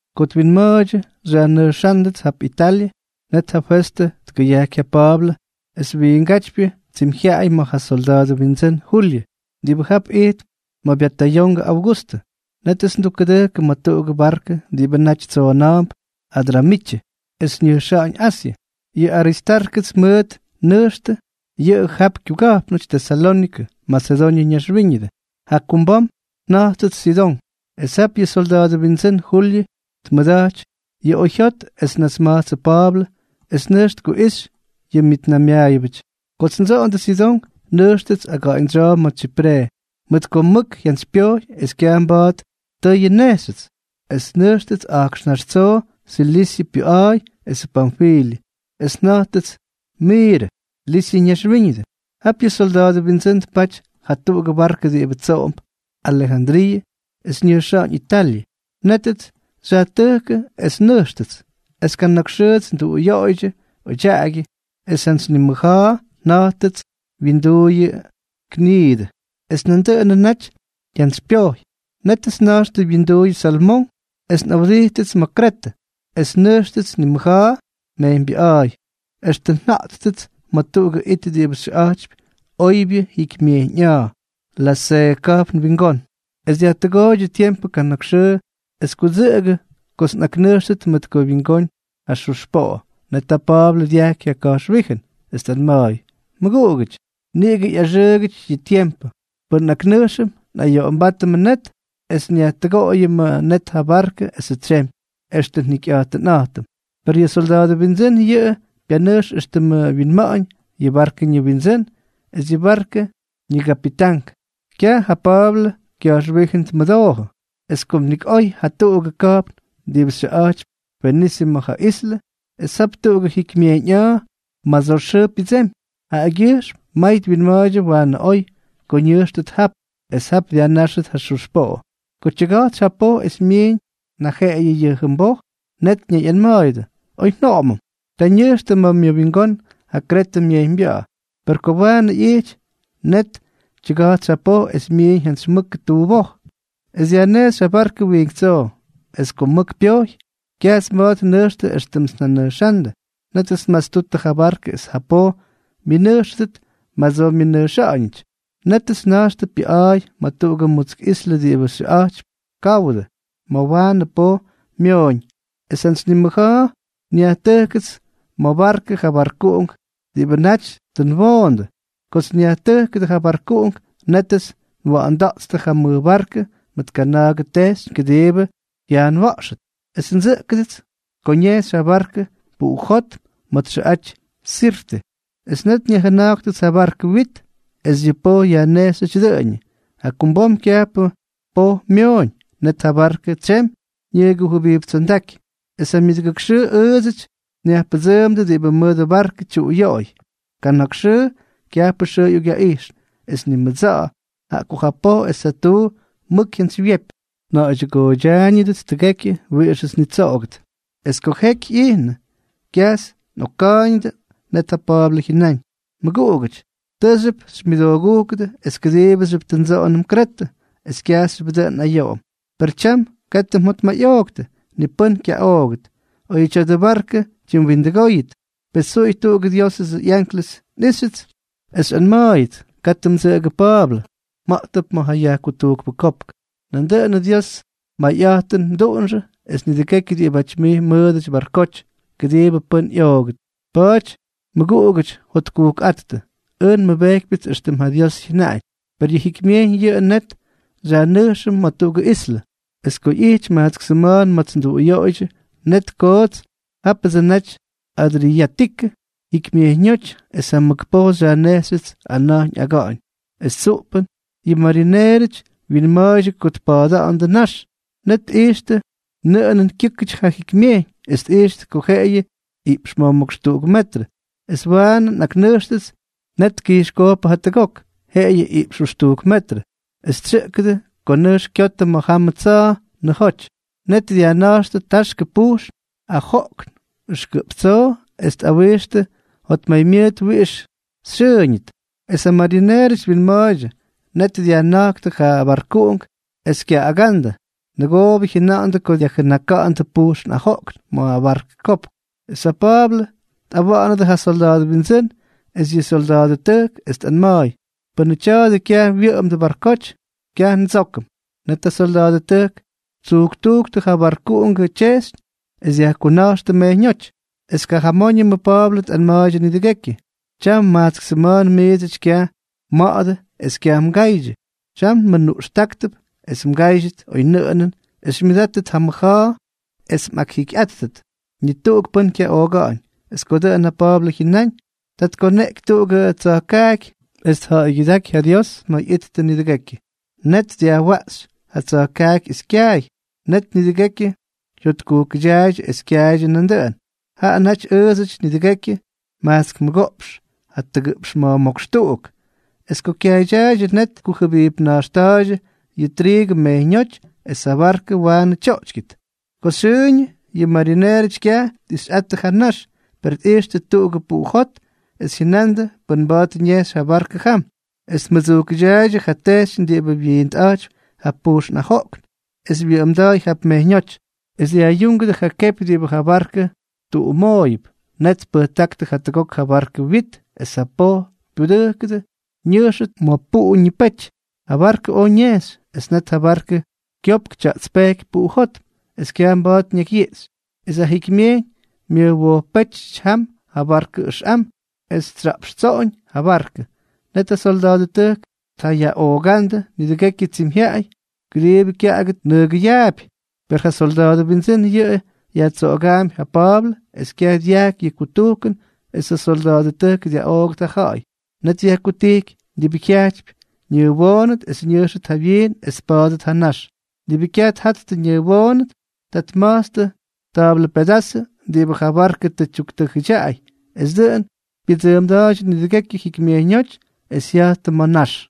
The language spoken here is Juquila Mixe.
Ko twinma̱a̱ydyʉ xyajnʉjxa̱ꞌa̱ndʉts jap Italyʉ, net ja Festʉ tkʉyajky ja Pa̱a̱blʉ esʉ wiingátypyʉ tsimyjyaꞌay ma̱ ja solda̱a̱dʉ windsʉ́n Julyʉ, diꞌibʉ jap ijtp ma̱ byatayongʉ Augustʉ. Nétʉts ndʉjkʉdʉ ma̱ tuꞌugʉ barkʉ diꞌibʉ naty tsoona̱a̱mp Adramityʉ es ñʉjxa̱ꞌa̱ñ Asyʉ. Yʉ Aristárkʉts mʉʉt nnʉjxtʉ, yʉꞌʉ jap kyuga̱jpnʉty Tesalónikʉ, Masedoñʉ ñaxwíñʉdʉ. Jakumbom nja̱jttʉts Sidón. Es jap yʉ solda̱a̱dʉ windsʉ́n Julyʉ tmʉda̱jty yʉ oyjyot es tnasma̱jtsʉ Pa̱a̱blʉ es nʉjx tkuꞌixy yʉ myʉtnaymyaayʉbʉty. Kots ndsoꞌondʉ Sidón, nʉjxtʉts aga̱ꞌa̱ñdsyoo ma̱ Tsyipre, mʉt ko mʉk jyantsypyojy es kyaj mba̱a̱t tʉyʉ nnejxyʉts. Es nnʉjxtʉts a̱jkxnáx tsoo Silisyʉ pyʉꞌa̱a̱y esʉ Panfilyʉ, es nja̱jttʉts Miirʉ, Lisyʉ ñaxwíñʉdʉ. Jap yʉ solda̱a̱dʉ windsʉ́n tpaty jatuꞌugʉ barkʉ diꞌibʉ tsoꞌomp Alejandriiʉ es ñʉjxa̱ꞌa̱ñ Italyʉ. Nétʉts xyajtʉjkʉ es nnʉjxtʉts. Es kana̱k xʉʉjʉts nduꞌuyoꞌoydyʉ odyaꞌagyʉ, es jantsy nimʉja̱a̱ nja̱jttʉts wyinduuyʉ Gniidʉ. Es nandʉꞌʉnʉ naty jyantsypyojy. Nétʉts nna̱jxtʉ wyinduuyʉ Salmón es nꞌawdijttʉts ma̱ Kretʉ, es nnʉjxtʉts nimʉja̱a̱ mejyñbyʉꞌa̱a̱y extʉ nja̱jttʉts ma̱ tuꞌugʉ it diꞌibʉ xyʉꞌa̱jtypy Oybyʉ Jyikymyejyñꞌa̱a̱, Laseeʉ ka̱jpn wingón. Es dyajtʉgooydyʉ tiempʉ kana̱k xʉʉ es kudsʉꞌʉgʉ kots nꞌaknʉjxtʉt mʉt ko wyingoonʉ ja xux poꞌo. Net ja Pa̱a̱blʉ dyajky ja ka̱jxwíjʉn, es tꞌanma̱a̱y: —Mʉguꞌugʉty, niꞌigʉ ꞌyaxʉʉgʉty yʉ tiempʉ. Pʉn nꞌaknʉjxʉm, nꞌayoꞌombátʉmʉ net es nyajtʉgoꞌoyʉmʉ net ja barkʉ esʉ tsemy, es extʉ njikyꞌa̱jtʉnꞌa̱jtʉm. Per yʉ solda̱a̱dʉ windsʉ́n yʉꞌʉ pyanʉjx éxtʉmʉ wyinma̱ꞌa̱ñ yʉ barkʉ ñiwindsʉ́n es yʉ barkʉ ñigapitank, kyaj ja Pa̱a̱blʉ kya̱jxwíjʉn tmʉdoojʉ. Es kom nik oy jatuꞌugʉ ka̱jpn diꞌibʉ xyʉꞌa̱jtypy Fenise ma̱ ja islʉ, es jap tuꞌugʉ jikymyejyñꞌa̱a̱ madsoo xʉʉ pyʉdsemy, jaꞌagyʉjxm may twinma̱a̱ydyʉ waanʉ oy ko ñʉjxtʉt jap, es jap dyajnáxʉt ja xux poꞌo. Ko tyʉga̱jtsy ja poj es myiiñ najeꞌeyʉ yʉ jʉmboj, net ñayꞌanma̱a̱yʉdʉ: —Oy njoꞌomʉm. Ta ñʉjxtʉ ma̱ myʉwingón ja Kretʉ myejyñbya̱ꞌa̱. Per ko waanʉ ꞌyijty, net tyʉga̱jtsy ja poj es myiiñ jantsy mʉk tuboj, es dyajnejxy ja barkʉ wiink tsoo. Es kom mʉk pyojy, kyajts mba̱a̱t nnʉjxtʉ éxtʉmts nnʉjxa̱ꞌa̱ndʉ. Nétʉts nmatstuttʉ ja barkʉ es ja poj myʉnʉjxʉdʉt madsoo myʉnʉjxa̱ꞌa̱ñʉty. Nétʉts nna̱jxtʉ pyʉꞌa̱a̱y ma̱ tuꞌugʉ mutsk islʉ diꞌibʉ xyʉꞌa̱jtypy Kaudʉ, ma̱ waanʉ poj myooñ. Es jantsy nimʉja̱a̱ nyajtʉjkʉts ma̱ barkʉ ja barkuꞌunk diꞌibʉdsʉ naty tʉ nwoondʉ. Kots nyajtʉjkʉdʉ ja barkuꞌunk, nétʉts nwoꞌonda̱ꞌtstʉ ja mʉj barkʉ mʉt kana̱a̱gʉ tejxyñ kʉdiibʉ jyaanwa̱ꞌxʉt. Es ndsʉꞌkʉdʉts ko ñejxy ja barkʉ puꞌujótm ma̱ txʉꞌaty Sirte. Es net nyajjʉna̱jktʉts ja barkʉ wit es yʉ poj yajnejxyʉty dʉꞌʉñʉ. Jakumbom kyajpʉ mʉk poj myooñ. Net ja barkʉ tsyemy ñʉgujʉbijptsondáky. Es ja myʉdʉgʉk xʉʉ ʉʉdsʉty nyajpʉdsʉʉmdʉ diꞌibʉ mʉdʉ barkʉ tyuꞌuyoꞌoy. Kana̱k xʉʉ kyajpʉ xʉʉ ꞌyokꞌyaꞌijxnʉ, es ni mʉdsa̱ꞌa̱, jaꞌa ko ja poj es ja tuu mʉk jyantsywyepy. Nja̱ꞌa̱ydyʉgooydyaayñʉts tʉgekyʉ wiꞌixʉts nnitsoꞌogʉt. Es ko jeky ꞌyijnʉ, kyajts nꞌokka̱a̱yñʉdʉ, net ja Pa̱a̱blʉ jyʉnáñ: —Mʉguꞌugʉty, tʉʉxyʉp xymyʉdoogúkʉdʉ es kʉdiibʉxyʉp tʉ ndsoꞌonʉm Kretʉ es kyajxyʉp dʉꞌʉn nꞌayoꞌom. Per tyam katʉ mjotmayꞌooktʉ, ni pʉ́n kyaꞌoogʉt, oy tya̱dʉ barkʉ wyindʉgóyʉt. Pes tsuꞌuy tuꞌugʉ Diosʉ ꞌyanklʉs nꞌijxyʉts, es xyꞌanma̱a̱yʉts: “Katʉ mdsʉꞌʉgʉ Pa̱a̱blʉ, mja̱ꞌtʉp ma̱ ja yajkutujkpʉ kopk. Nandʉꞌʉnʉ Diosʉ mayꞌa̱jtʉn mduꞌunxʉ es nidʉgekyʉ diꞌibáty mij mmʉʉdʉty barkoty, kʉdiibʉ pʉ́n ꞌyoogʉt.” Pa̱a̱ty mʉguꞌugʉty, jotkujkꞌáttʉ. Ʉj nmʉbejkypyʉts éxtʉm ja Dios jyʉnaꞌañ. Per yʉ jikymyejyñ yʉꞌʉ net xyajnʉjxʉm ma̱ tuꞌugʉ islʉ. Es ko ꞌyijty majtsk sʉma̱a̱n ma̱ts nduꞌuyoꞌoydyʉ, net koots jápʉdsʉ naty Adriyátikʉ Jikymyejyñóty es ja mʉk poj xyajnejxyʉts ana̱jñ aga̱ꞌa̱ñ. Es tsuꞌpʉn yʉ marineerʉty wyinma̱a̱ydyʉ ko tpa̱a̱da̱ꞌa̱ndʉ nax. Net tkijxtʉ nʉꞌʉnʉn kyʉ́kʉty ja jikymyejyñ, es tꞌijxtʉ ko jeꞌeyʉ iꞌpx ma̱jmókx tuꞌuk metrʉ. Es waanʉ nꞌaknʉjxtʉts, net tkijxkojkpʉ jatʉgok. Jeꞌeyʉ iꞌpx jʉxtujk metrʉ. Es tsyʉꞌkʉdʉ ko nʉjx kyotʉ ma̱ jamʉ tsa̱a̱ nʉjoty. Net dyajjʉna̱jktʉ taxkʉ pujxn ajoꞌkn ʉxkʉꞌp tsoo es tꞌawixtʉ jotmaymyʉʉt wiꞌix xyʉʉñʉt. Es ja marineerʉty twinma̱a̱ydyʉ, net dyajjʉna̱jktʉ ja barkuꞌunk es kyaꞌaga̱ꞌa̱ndʉ. Nʉgoobʉ jyʉnandʉ ko dyajjʉnaka̱ꞌa̱ndʉ pujxn ajoꞌkn ma̱ barkʉ kopk. Es ja Pa̱a̱blʉ tꞌawa̱ꞌa̱nʉdʉ ja solda̱a̱dʉ windsʉ́n es yʉ syolda̱a̱dʉtʉjk, es tꞌanma̱a̱y: —Pʉnʉ tya̱a̱dʉ kyaj wyʉꞌʉmdʉ barkoty, kyaj ndsókʉm. Net ja solda̱a̱dʉtʉjk ttsujktujktʉ ja barkuꞌungʉ tyejxyñ es dyajkuna̱jxtʉ mejyñóty. Es kajamóñʉmʉ Pa̱a̱blʉ tꞌanma̱a̱ydyʉ nidʉgekyʉ: —Tyam majtsk sʉma̱a̱n miidsʉty kyaj mma̱ꞌa̱dʉ es kyaj mgaydyʉ. Tyam nmʉnuꞌxtáktʉp es mgáydyʉt oynʉꞌʉnʉn es xymyʉdátʉt ja mʉja̱a̱ es mꞌakjikyꞌáttʉt. Ni tuꞌuk pʉ́n kyaꞌooga̱ꞌa̱ñ. Es ko dʉꞌʉn ja Pa̱a̱blʉ jyʉnáñ, ta tkoneꞌky tuꞌugʉ tsa̱jkaaky, es tja̱ꞌa̱ygyʉdáky ja Dios ma̱ ꞌyittʉ nidʉgekyʉ. Net dyajwaꞌxy ja tsa̱jkaaky es kyaay. Net nidʉgekyʉ jyotkujkʉdyaaydyʉ es kyaaydyʉ nandʉꞌʉn. Jaꞌa naty ʉʉdsʉty nidʉgekyʉ majtsk mʉgoꞌpx jatʉgʉꞌpx ma̱jmókx tuꞌuk. Es ko kyaaydyaaydyʉ, net tkujʉbijpna̱jxta̱a̱ydyʉ yʉ triigʉ mejyñóty es ja barkʉ waanʉ tyoꞌtykyʉt. Ko xyʉʉñʉ yʉ marineerʉty kyaj tꞌixyꞌattʉ ja nax, per tꞌijxtʉ tuꞌugʉ puꞌu jot es jyʉnandʉ pʉn mba̱a̱t ñejxy ja barkʉ jam. Es tmʉdsujkʉdyaaydyʉ ja tejxyñ diꞌibʉ wyiintꞌa̱jtypy ja pujxn ajoꞌkn, es wyʉꞌʉmda̱a̱y jap mejyñóty. Es dyajꞌyuungʉdʉ ja kepy diꞌibʉ ja barkʉ tuꞌumooyʉp. Net tpʉjtákʉ jatʉgok ja barkʉ wyit es ja poj pyudʉ́kʉdʉt ñʉjxʉt ma̱ puꞌu ñipety. Ja barkʉ oj ñejxy. Esʉ net ja barkʉ kyopk tya̱ꞌtspejky puꞌujótm es kyaj mba̱a̱t ñakyyiꞌxy, es ja jikymyejyñ myʉjwojppéty jam barkʉ ʉxꞌam es tsya̱ꞌpxtsoꞌoñ ja barkʉ. Net ja solda̱a̱dʉtʉjk tjayaꞌoogándʉ nidʉgekyʉ tsimyjyaꞌay kʉdiibʉ kyaꞌagʉt nʉgʉyaapy. Per ja solda̱a̱dʉ windsʉ́n yʉꞌʉ yajtsoꞌogaampy ja Pa̱a̱blʉ es kyaj dyajky yʉ kutujkʉn es ja syolda̱a̱dʉtʉjk dyaꞌoogʉt ja ja̱ꞌa̱y. Net dyajkutijky diꞌibʉ jyajtypy ñʉʉwoonʉt es ñʉjxʉt jawyiin es tpa̱a̱dʉt ja nax. Diꞌibʉ kyaj tjattʉ ñʉʉwoonʉt, ta tma̱jtstʉ ta̱a̱blʉ pedazʉ diꞌibʉ ja barkʉ tʉ tyuktʉjʉdyaꞌay, es dʉꞌʉn pyʉdsʉʉmda̱a̱ydyʉ nidʉgekyʉ jikymyejyñóty, es jya̱jttʉ ma̱ nax.